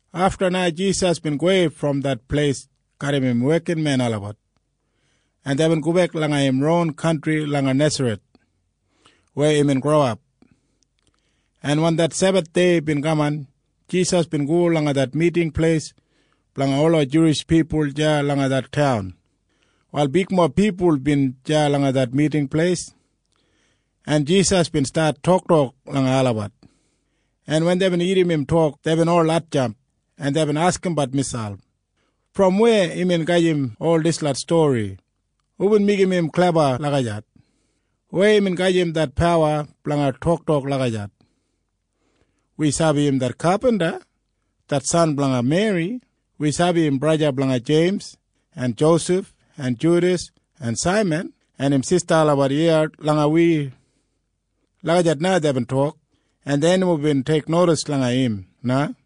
Afta na Jisas bin gowei brom det pleis garram im wekinmen olabat, en deibin gobek langa im ron kantri langa Nesareth weya imbin growap, en wen det Sebathdei bin kaman, Jisas bin go langa det Miting Pleis blanga ola Juwish pipul deya langa det taun. Wal bigmob pipul bin deya langa det Miting Pleis, en Jisas bin stat toktok langa olabat, en wen deibin irrim im tok, deibin ol hatjamp, en deibin askimbat miselp, “Brom weya imbin gajim ol dislot stori? Hubin meigim im kleba lagijat? Weya imbin gajim det pawa blanga toktok lagijat? Wi sabi im det kapinta, det san blanga Meri. Wi sabi im braja blanga Jeims en Josef en Judas en Saiman. En im sista olabat iya garram wi.” Lagijat na deibin tok, en dei nomo bin teiknodis langa im na.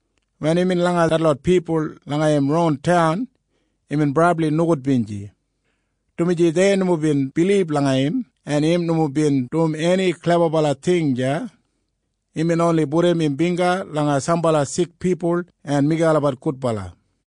Wen imbin deya langa detlot pipul langa im ron taun imbin brabli nogudbinji, dumaji dei nomo bin bilib langa im. En im nomo bin dum eni klebabala ting deya. Imbin oni pudum im bingga langa sambala sik pipul en meigim olabat gudbala.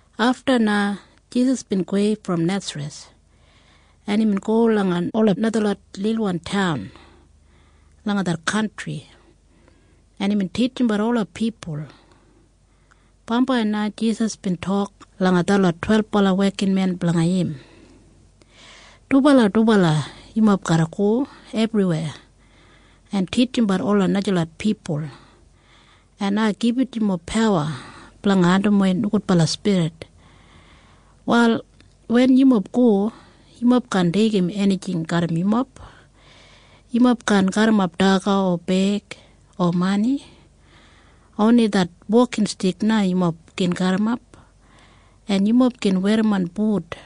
Afta na Jisas bin gowei brom Nesareth, en imbin go langa ola najalot lilwan taun langa det kantri, en imbin titjimbat ola pipul. Bambai na Jisas bin tok langa detlot twelbala wekinmen blanga im. Imbin tok, “Yumob garra go ebriweya dubala gija blanga titjimbat ola najalot pipul, en ai gibit yumob pawa blanga andimwei nogudbala spirit. “Wal wen yumob go, yumob kaan deigim enijing garram yumob. Yumob kaan garrimap daga o beig o mani. Oni det wokinstik na yumob gin garrimap. En yumob gin werrimon but.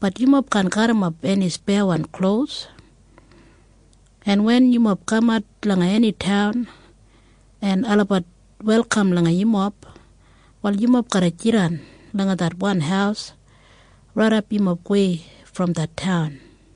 Bat yumob kaan garrimap eni speyawan klos. En wen yumob kamat langa eni taun, en olabat welkam yumob, wal yumob garra jidan langa det wan haus raidap yumob gowei brom det taun.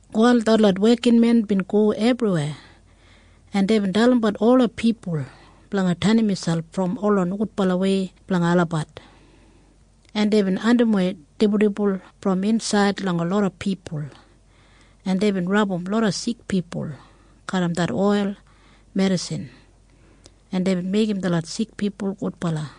Wal detlot wekinmen bin go ebriweya, en deibin dalimbat ola pipul blanga tenim miselp brom ola nogudbalawei blanga olabat, en deibin andimwei dibuldibul brom insaid langa loda pipul, en deibin rabum loda sik pipul garram det oil medisin, en deibin meigim detlot sik pipul gudbala.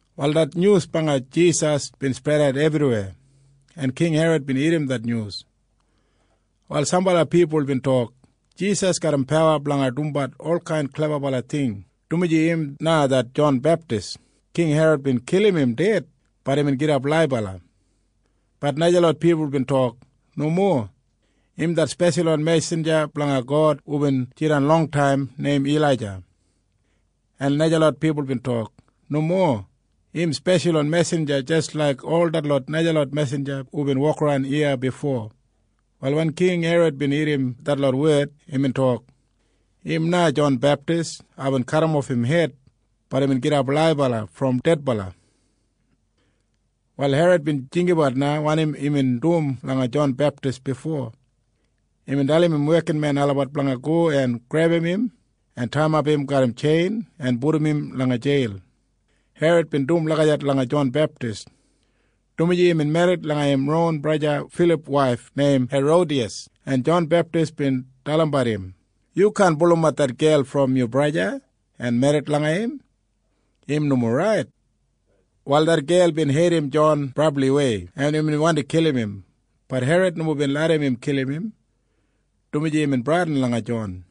Wal det nyus blanga Jisas bin spredat ebriweya, en King Herod bin irrim det nyus. Wal sambala pipul bin tok, “Jisas garram pawa blanga dumbat olkain klebabala ting, dumaji im na det Jon Beptis. King Herod bin kilim im ded. Bat imbin gidap laibala.” Bat najalot pipul bin tok, “Nomo. Im det speshalwan mesinja blanga God hubin jidan longtaim neim Ilaija.” En najalot pipul bin tok, “Nomo. Im speshalwan mesinja jis laik ol detlot najalot mesinja hubin wokaran iya bifo.” Wal wen King Herod bin irrim detlot wed, imbin tok, “Im na Jon Beptis. Aibin kadimof im hed. Bat imbin gidap laibala brom dedbala.” Wal Herod bin jinggabat na wanim imbin dum langa Jon Beptis bifo. Imbin dalim im wekinmen olabat blanga go en grebum im en taiyimap im garram tjein en pudum im langa jeil. Herod bin dum lagijat langa Jon Beptis, dumaji imbin merrit langa im ron braja Filip waif neim Herodiyas, en Jon Beptis bin dalimbat im, “Yu kaan pulumat det gel brom yu braja en merrit langa im. Im nomo rait.” Wal det gel bin heidim Jon brabliwei, en imbin wandi kilim im. Bat Herod nomo bin larram im kilim im, dumaji imbin bradin langa Jon.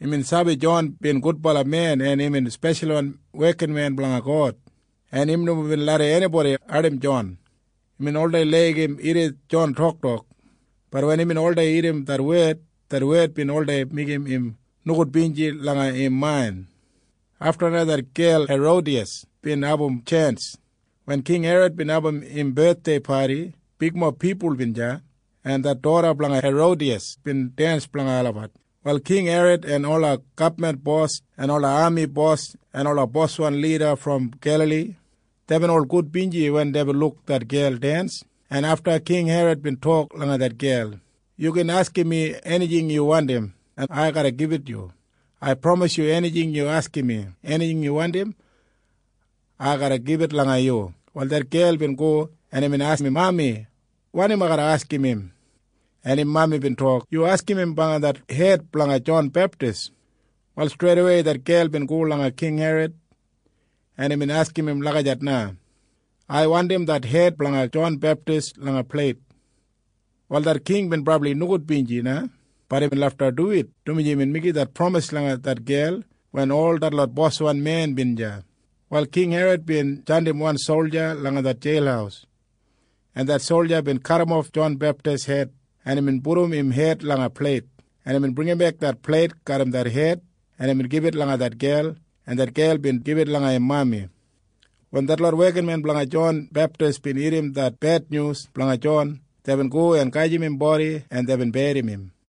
Imbin sabi Jon bin gudbala men en imbin speshalwan wekinmen blanga God, en im nomo bin larram enibodi ardim Jon. Imbin oldei laigim irrim Jon toktok. Bat wen imbin oldei irrim det wed, det wed bin oldei meigim im nogudbinji langa im main. Afta na det gel neim Herodiyas bin abum tjens. Wen King Herod bin abum padi blanga im bethdei, bigmob pipul bin deya, en det doda blanga Herodiyas bin densdens blanga olabat. Wal King Herod en ola gabman bos en ola ami bos en ola boswan lida brom Gelali, deibin ol gudbinji wen deibin luk det gel dens, en afta King Herod bin tok langa det gel, “Yu gin askim mi enijing yu wandim, en ai garra gibit yu. Ai pramisim yu enijing yu askim mi. Enijing yu wandim, ai garra gibit langa yu.” Wal det gel bin go, en imbin askim im mami, “Wanim ai garra askim im, Mami?” En im mami bin tok, “Yu askim im blanga det hed blanga Jon Beptis.” Wal streidawei det gel bin go langa King Herod, en imbin askim im lagijat na, “Ai wandim det hed blanga Jon Beptis langa pleit.” Wal det king bin brabli nogudbinji na. Bat imbin lafta duwit, dumaji imbin meigim det pramis langa det gel wen ol detlot boswan bin deya. Wal King Herod bin jandim wan solja langa det jeil, en det solja bin kadimof Jon Beptis hed, en imbin pudum im hed langa pleit, en imbin bringimbek det pleit garram det hed, en imbin gibit langa det gel, en det gel bin gibit langa im mami. Wal wen detlot wekinmen blanga Jon Beptis bin irrim det bednyus blanga Jon, deibin go en gajim im bodi, en deibin berrim im.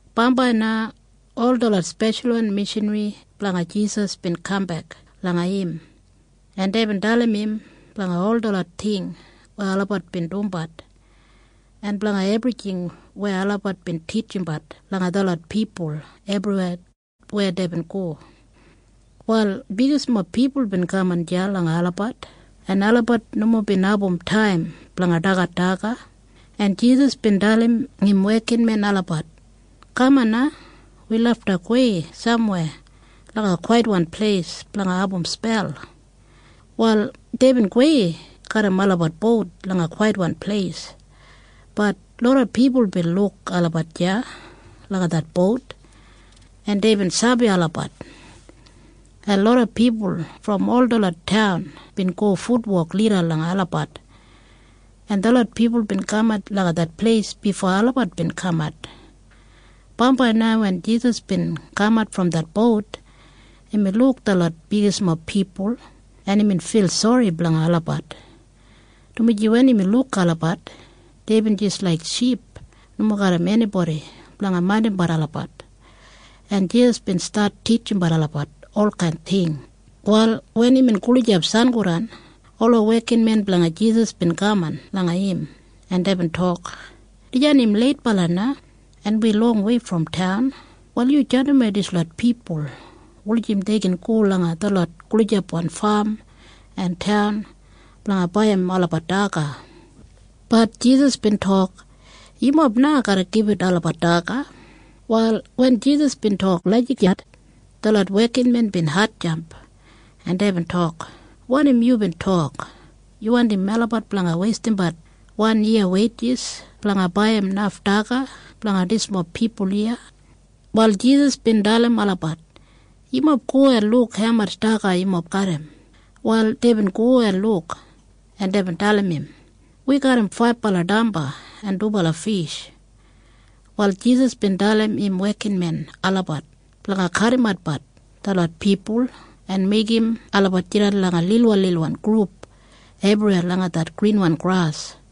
Bambai na ol detlot speshalwan mishanri blanga Jisas bin kambek langa im, en deibin dalim im blanga ol detlot ting weya olabat bin dumbat en blanga ebrijing weya olabat bin titjimbat langa detlot pipul ebriweya weya deibin go. Wal bigismob pipul bin kaman deya langa olabat, en olabat nomo bin abum taim blanga dagat daga, en Jisas bin dalim im wekinmen olabat, “Kaman na. Wi lafta gowei samweya langa kwaitwan pleis blanga abum spel.” Wal deibin gowei garram olabat bout langa kwaitwan pleis. Bat loda pipul bin luk olabat deya langa det bout, en deibin sabi olabat, en loda pipul brom ol detlot taun bin go futwok lida langa olabat, en detlot pipul bin kamat langa det pleis bifo olabat bin kamat. Bambai na wen Jisas bin kamat brom det bout, imbin luk detlot bigismob pipul, en imbin fil sori blanga olabat, dumaji wen imbin luk olabat, deibin jis laik ship nomo garram enibodi blanga maindimbat olabat. En Jisas bin stat titjimbat olabat olkain ting. Wal wen imbin gulijap sangodan, ola wekinmen blanga Jisas bin kaman langa im, en deibin tok, “Dijan im leitbala na, en wi longwei brom taun. Wal yu jandimwei dislot pipul wulijim dei gin go langa detlot gulijapwan fam en taun blanga baiyim olabat daga.” Bat Jisas bin tok, “Yumob na garra gibit olabat daga.” Wal wen Jisas bin tok lagijat, detlot wekinmen bin hatjamp, en deibin tok, “Wanim yubin tok? Yu wandim melabat blanga weistimbat wan yiya weijis blanga baiyim naf daga blanga dismob pipul iya?” Wal Jisas bin dalim olabat, “Yumob go en luk haumatj daga yumob garram.” Wal deibin go en luk, en deibin dalim im, “Wi garram faibala damba en dubala fish.” Wal Jisas bin dalim im wekinmen olabat blanga kadimat detlot pipul en meigim olabat jidan langa lilwanlilwan grup ebriweya langa det grinwan gras,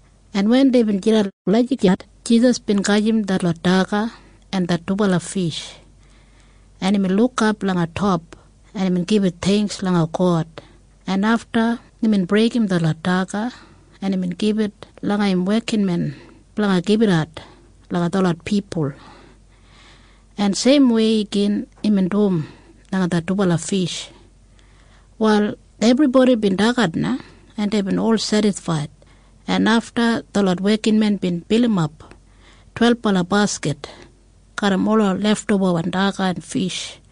En wen deibin jidan lagijat, Jisas bin gajim detlot daga en det dubala fish, en imbin lukap langa top, en imbin gibit theingks langa God, en afta imbin breigim detlot daga, en imbin gibit langa im wekinmen blanga gibitat langa detlot pipul. En seimwei igin imbin dum langa det dubala fish. Wal ebribodi bin dagat na, en deibin ol sedisfaid, en afta detlot wekinmen bin bilimap twelbala baskit garram ola leftobawan daga en fish.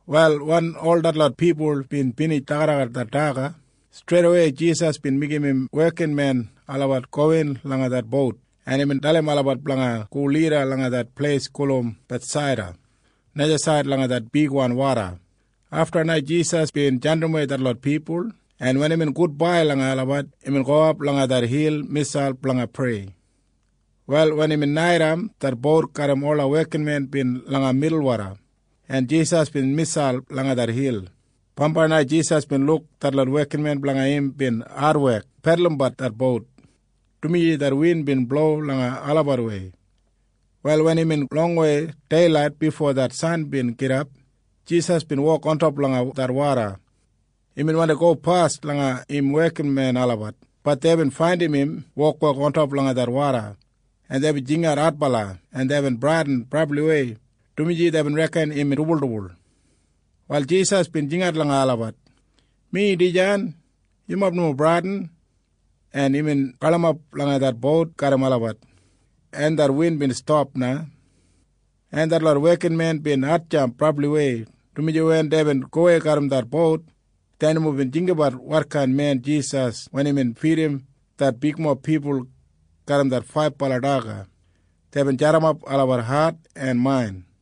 Wal wen ol detlot pipul bin binij dagadagat det daga, streidawei Jisas bin meigim im wekinmen olabat gowin langa det bout, en imbin dalim olabat blanga go lida langa det pleis gulum Bethsaida najasaid langa det bigwan woda. Afta na Jisas bin jandimwei detlot pipul, en wen imbin tok gudbai langa olabat, imbin gowap langa det hil miselp blanga prei. Wal wen imbin naitaim, det bout garram ola wekinmen bin langa milwoda, en Jisas bin miselp langa det hil. Bambai na Jisas bin luk detlot wekinmen blanga im bin adwek pedulumbat det bout, dumaji det win bin blowim langa olabatwei. Wal wen imbin longwei deilait bifo det san bin gidap, Jisas bin wok ontop langa det woda. Imbin wandi gopas langa im wekinmen olabat. Bat deibin faindim im wokwok ontop langa det woda, en deibin jingat adbala, en deibin bradin brabliwei, dumaji deibin reken im dibuldibul. Wal Jisas bin jingat langa olabat, “Mi dijan. Yumob nomo bradin.” En imbin galimap langa det bout garram olabat, en det win bin stap na, en detlot wekinmen bin hatjamp brabliwei, dumaji wen deibin gowei garram det bout, dei nomo bin sabi wotkain men Jisas wen imbin fidim det bigmob pipul garram det faibala daga. Deibin jadimap olabat hat en main.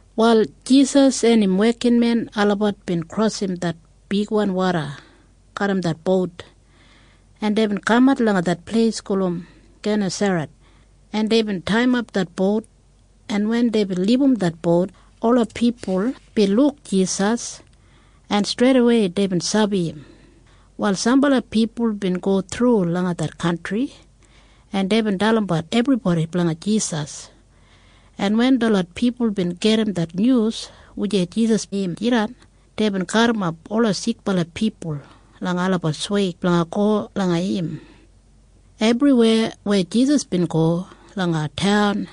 Wal Jisas en im wekinmen olabat bin krosim det bigwan woda garram det bout, en deibin kamat langa det pleis gulum Genesaret, en deibin taiyimap det bout, en wen deibin libum det bout, ola pipul bin luk Jisas, en streidawei deibin sabi im. Wal sambala pipul bin go thru langa det kantri, en deibin dalimbat ebribodi blanga Jisas, en wen detlot pipul bin gedim det nyus blanga wujei Jisas bin jidan, deibin garrimap ola sikbala pipul langa olabat sweig blanga go langa im. Ebriweya weya Jisas bin go langa taun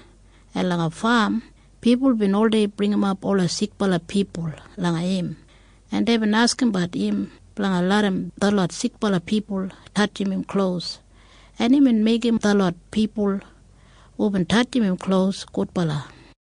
en langa fam, pipul bin oldei bringimap ola sikbala pipul langa im, en deibin askimbat im blanga larram detlot sikbala tatjim im klos, en imbin meigim detlot pipul hubin tatjim im klos, gudbala.